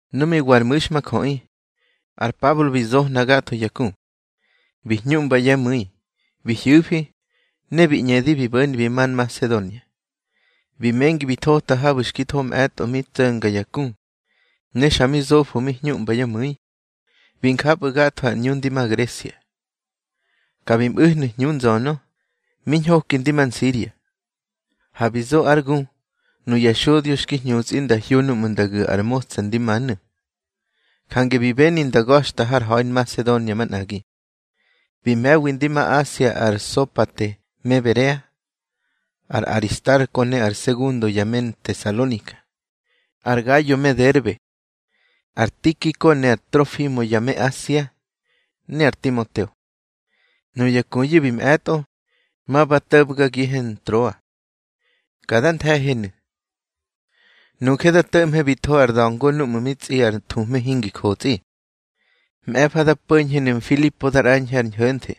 Nu mi wa ar mu̱xmajöꞌi, ar Pablo bi zohna gatho ya ku, bi hñuꞌmba yá mu̱i, bi hyu̱fi, ne bi ñꞌedi bi bo̱ni bi ma Nmasedonia. Bi mengi bi thota habu̱ xki tho mꞌe̱tꞌo mi tso̱nga ya ku, ne xa mi zofo mi huꞌmba yá mu̱i. Bi japꞌu̱ gatho ar ꞌñu ndi ma Gresia. Ka bi mꞌu̱hnu̱ hñu nzönö, mi ñhoki ndi ma Nsiria. Ha bi zo ár gu nuya xodyo xki hñutsꞌi nda hyo núꞌmu̱ nda gu̱ ar motsa ndi manu̱, jange bi beni nda ga̱xta har ha̱i Nmasedonia manꞌagi. Bi me̱wi ndi ma Asia ar Sopate me Berea, ar Aristarko ne ar Segundo ya me Ntesalonika, ar Gayo me Derbe, ar Tikiko ne ar Trofimo ya me Asia, ne ar Timoteo. Nuya kuyu̱ bi mꞌe̱tꞌo, ma ba to̱bgagihe Ntroa. Ka dá nthe̱henu̱. Nuje da to̱ꞌmhe bi tho ar da̱ngo núꞌmu̱ tsꞌi ar thuhme hingi jotsꞌi. Mꞌe̱fa da po̱ñhenu̱ Mfilipo, da ꞌrañhe ar ñho̱nthe.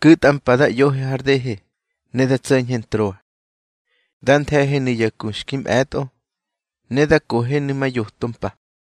Ku̱tꞌa mpa da ꞌyohe har dehe, ne da tso̱ñhe Ntroa. Dá nthe̱henu̱ ya ku xki mꞌe̱tꞌo, ne da kohenu̱ ma yoto mpa.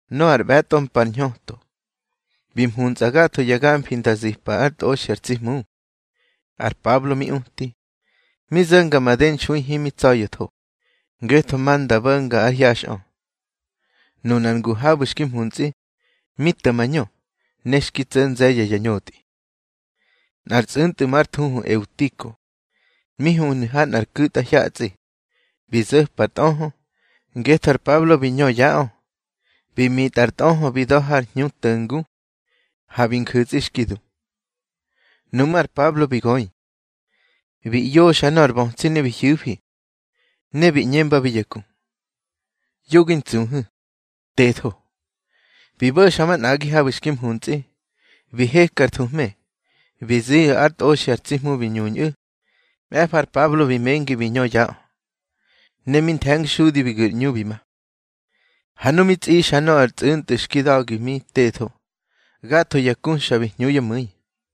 Nöꞌö ár ꞌbe̱tꞌo mpa ar hñöto, bi mhuntsꞌa gatho ya gamfi nda zipa ár tꞌoxi ar tsi Hmu. Ar Pablo mi uti, mi zo̱nga made nxui himi tsa̱ya̱tho, ngetho ma nda bo̱nga ár hyaxꞌö. Nunar ngu habu̱ xki mhuntsꞌi, mi to̱ mañö, ne xki tso̱ nze̱ye̱ ya ñotꞌi. Nꞌar tsꞌu̱ntꞌu̱ már thuhu Eutiko, mi huhnu̱ ha nꞌar ku̱tꞌahyatsꞌi. Bi zo̱par tꞌöhö, ngetho ar Pablo bi ñö yaꞌö. Mi mitꞌar tꞌöhö bi da̱ har hñu nto̱ngu. Ha bi nju̱tsꞌi, xki du. Nuꞌmú̱ ar Pablo bi göi, bi ꞌyoxa nöꞌö ar bötsi ne bi hyu̱fi. Ne bi ꞌñembabi ya ku: —Yo gi ntsuhu̱, tetho. Bi bo̱xa manꞌagi habu̱ xki mhuntsꞌi. Bi heka ar thuhme, bi ziꞌu̱ ár tꞌoxi ar tsi Hmu bi ñuñꞌu̱. Mꞌe̱fa ar Pablo bi mengi bi ñö yaꞌö, ne mi nthe̱ngxudi bi gu̱r ꞌñu bi ma. Ha nu mi tsꞌixa nöꞌö ar tsꞌu̱ntꞌu̱ xki da̱gi mi tetho, gatho ya ku xa bi hñu yá mu̱i.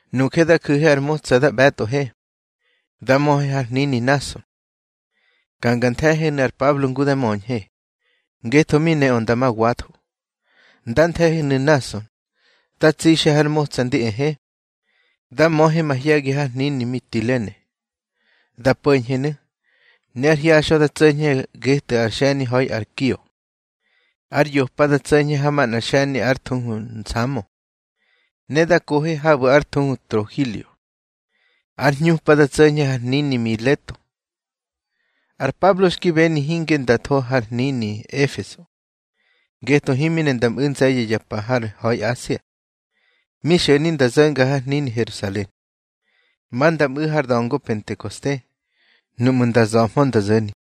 Nuje da ju̱he ar motsa da ꞌbe̱tꞌohe, da möhe har hnini Nꞌason, ka nga nthe̱henu̱ ar Pablo ngu dá möñhe, ngetho mi neꞌö nda ma watho. Nda nthe̱henu̱ Nꞌason, da tsixe har motsa ndi ehe, da möhe mahye̱gi har hnini Mitilene. Da po̱ñhenu̱, ne ár hyaxꞌö da tso̱ñhe getꞌu̱ har xe̱ni ha̱i Kio. Ár yopa da tso̱ñhe ha manꞌa xe̱ni ár thuhu Nsamo, ne da kohe habu̱ ár thuhu Trogilio. Ár hñupa da tso̱ñhe har hnini Mileto. Ar Pablo xki beni hinge nda tho har hnini Efeso, ngetho himi ne nda mꞌu̱ nze̱ye̱ ya pa har ha̱i Asia. Mi xo̱ni nda zo̱nga har hnini Herusalen, ma nda mꞌu̱ har da̱ngo Pentekoste, nuꞌmu̱ nda za̱mhö nda zo̱ni.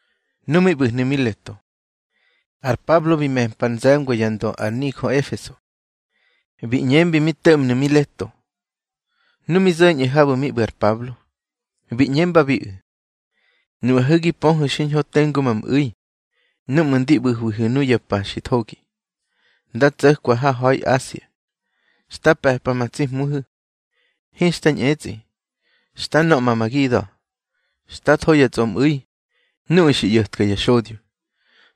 Nu mi ꞌbu̱hnu̱ Mileto, ar Pablo bi me̱mpa ar nze̱ngwa yá ndö ar nijö Efeso, bi ꞌñembi mi to̱ꞌmnu̱ Mileto. Nu mi zo̱ñꞌu̱ habu̱ mi ꞌbu̱ ar Pablo, bi ꞌñembabiꞌu̱: —Nuꞌahu̱ gi pöhu̱ xiñho tengu ma mꞌu̱i núꞌmu̱ ndi ꞌbu̱hwihu̱ nuya pa xi thogi, nda tso̱kwa har ha̱i Asia. Xta pe̱pa ma tsi Hmuhu̱, hinxta ñꞌetsꞌi. Xta nöꞌma ma gida̱, xta tho ya tsꞌomꞌu̱i nuꞌu̱ xi ꞌyo̱tka ya xodyo,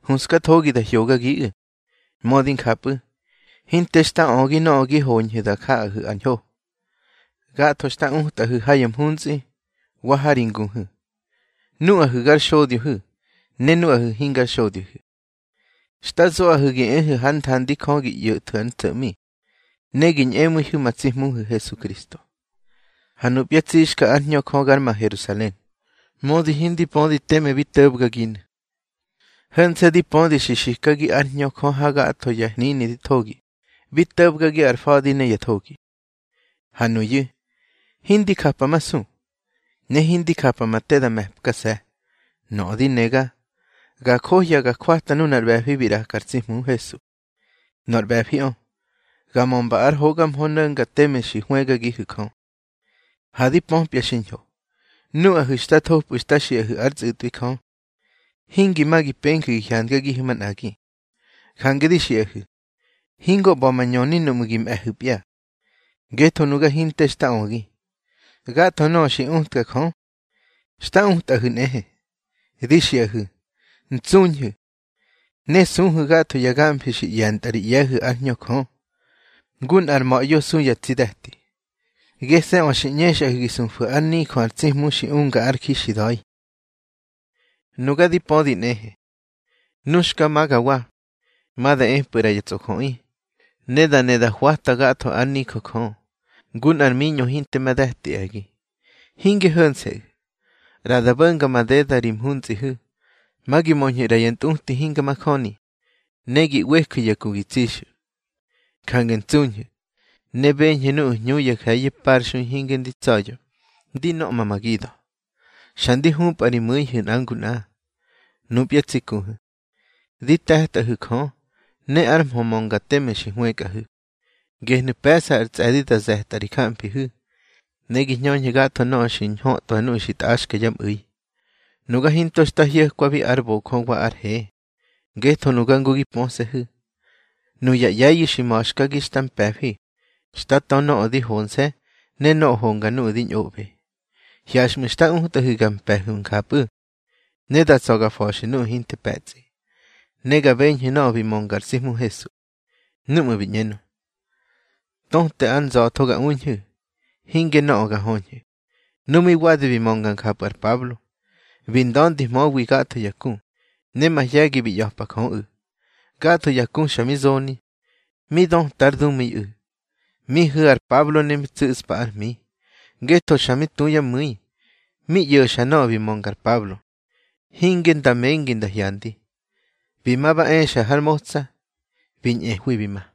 huꞌskathogi da hyogagiꞌu̱. Mödi njapꞌu̱, hinte xta ögi nöꞌö gi hoñhu̱ da jaꞌahu̱ ar ñho. Gatho xta utꞌahu̱ ha ya mhuntsꞌi wa ha ri nguhu̱. Nuꞌahu̱ gar xodyohu̱ ne nuꞌu̱ hingya xodyohu̱, xta zoꞌahu̱ gi ehu̱ hár nthandi Jö gi ꞌyo̱thwu̱ ár ntso̱ꞌmi, ne gi ñꞌemu̱ihu̱ ma tsi Hmuhu̱ Hesukristo. Ha nupya tsixka ár Hñö Jö gar ma Herusalen, mödi hindi pödi teme bi to̱bgaginu̱. Ho̱nse̱ di pödi xi xikagi ár Hñö Jö ha gatho ya hnini di thogi, bi to̱bgagi ar fa̱di ne ya thogi. Ha nuyu̱, hindi japamasu, ne hindi japa ma te da me̱pkase̱. Nöꞌö di nega, ga johya ga jwata nunar ꞌbe̱fi bi ꞌraka ar tsi Hmu Hesu. Nor ꞌbe̱fiꞌö, ga mömba ár hoga mhö no̱nga teme xi hwëgagihu̱ Jö. Ha di pöpya xiñho, nuꞌahu̱ xtá thopꞌu̱ xta xiꞌahu̱ ár tsꞌutꞌwi Jö, hingi ma gi penju̱ gi hyandagihu̱ manꞌagi. Jange di xiꞌahu̱, hingo ꞌba̱ ma ñöni núꞌmu̱ gi mꞌe̱hu̱pya. Ngetho nuga hinte xta ögi. Gatho nöꞌö xi utka Jö, xta utꞌahu̱ nꞌehe. Di xiꞌahu̱, ntsuñhu̱, ne suhu̱ gatho ya gamfi xi ꞌye̱ntꞌahu̱ ri ꞌye̱hu̱ ár Hñö Jö, ngu nꞌar ma̱ꞌyo su yá tsi de̱ti. Gese̱ꞌö xi ꞌñexꞌahu̱ gi sufu̱ ár nijö ar tsi Hmu xi unga ár ji xi da̱i. Nuga di pödi nꞌehe, nu xka magawa, ma da epꞌu̱ ꞌra ya tsꞌojöꞌi, da ne da hwatwa gatho ár nijö Jö, ngu nꞌar miñꞌo hinte ma de̱ti e̱gi. Hinge ho̱nse̱ꞌu̱, ꞌra da bo̱nga madeda ri mhuntsꞌihu̱, ma gi möñhu̱ ꞌra ya ntꞌuti hinga majöni, ne gi ꞌweju̱ ya ku gi tsixu̱. Jange ntsuñhu̱, ne beñhu̱ nuꞌu̱ hñu nje̱ye̱ parxui hinge ndi tsa̱ya̱ ndi nöꞌma ma gida̱, xa ndi hupꞌa ri mu̱ihu̱ nꞌa ngu nꞌa. Nupya tsi kuhu̱, di te̱tꞌahu̱ Jö ne ár mhö mönga teme xi hwëkꞌahu̱. Gehnu̱ pe̱ꞌsa ar tsꞌe̱di da ze̱tꞌa ri jamfihu̱, ne gi hñöñhu̱ gatho nöꞌö xi ñhötꞌwa nuꞌu̱ xi tꞌaxka yá mꞌu̱i. Nuga hinto xta hyo̱kwabi ár bojö wa ár he. Ngetho nuga ngu gi pöse̱hu̱, nuya ꞌye̱yu̱ xi ma̱xkagi xta mpe̱fi xta tö nöꞌö ndi honse̱ ne nöꞌö honga nuꞌu̱ di ñꞌoꞌbe. Hyaxꞌmu̱ xta utꞌahu̱ ga mpe̱hu̱ njapꞌu̱, ne da tsa̱ ga fa̱xu̱ nuꞌu̱ hinte pe̱tsꞌi. Ne ga beñhu̱ nöꞌö bi mönga ar tsi Hmu Hesu, núꞌmu̱ bi ꞌñenö: Töte ár nza̱tho ga uñhu̱, hinge nöꞌö ga höñhu̱. Nu mi wadi bi mönga njapꞌu̱ ar Pablo, bi nda̱ndihmöwi gatho ya ku, ne mahye̱gi bi ꞌya̱pa Jöꞌu̱. Gatho ya ku xa mi zoni, mi döta ár dumu̱iꞌu̱. Mi hu̱ ar Pablo ne mi tsu̱ꞌspa ár hmi. Ngetho xa mi tu yá mu̱i mi ꞌyo̱xa nöꞌö bi mönga ar Pablo, hinge nda mengi nda hyandi. Bi ma ba exa har motsa, bi ñꞌehwi bi ma.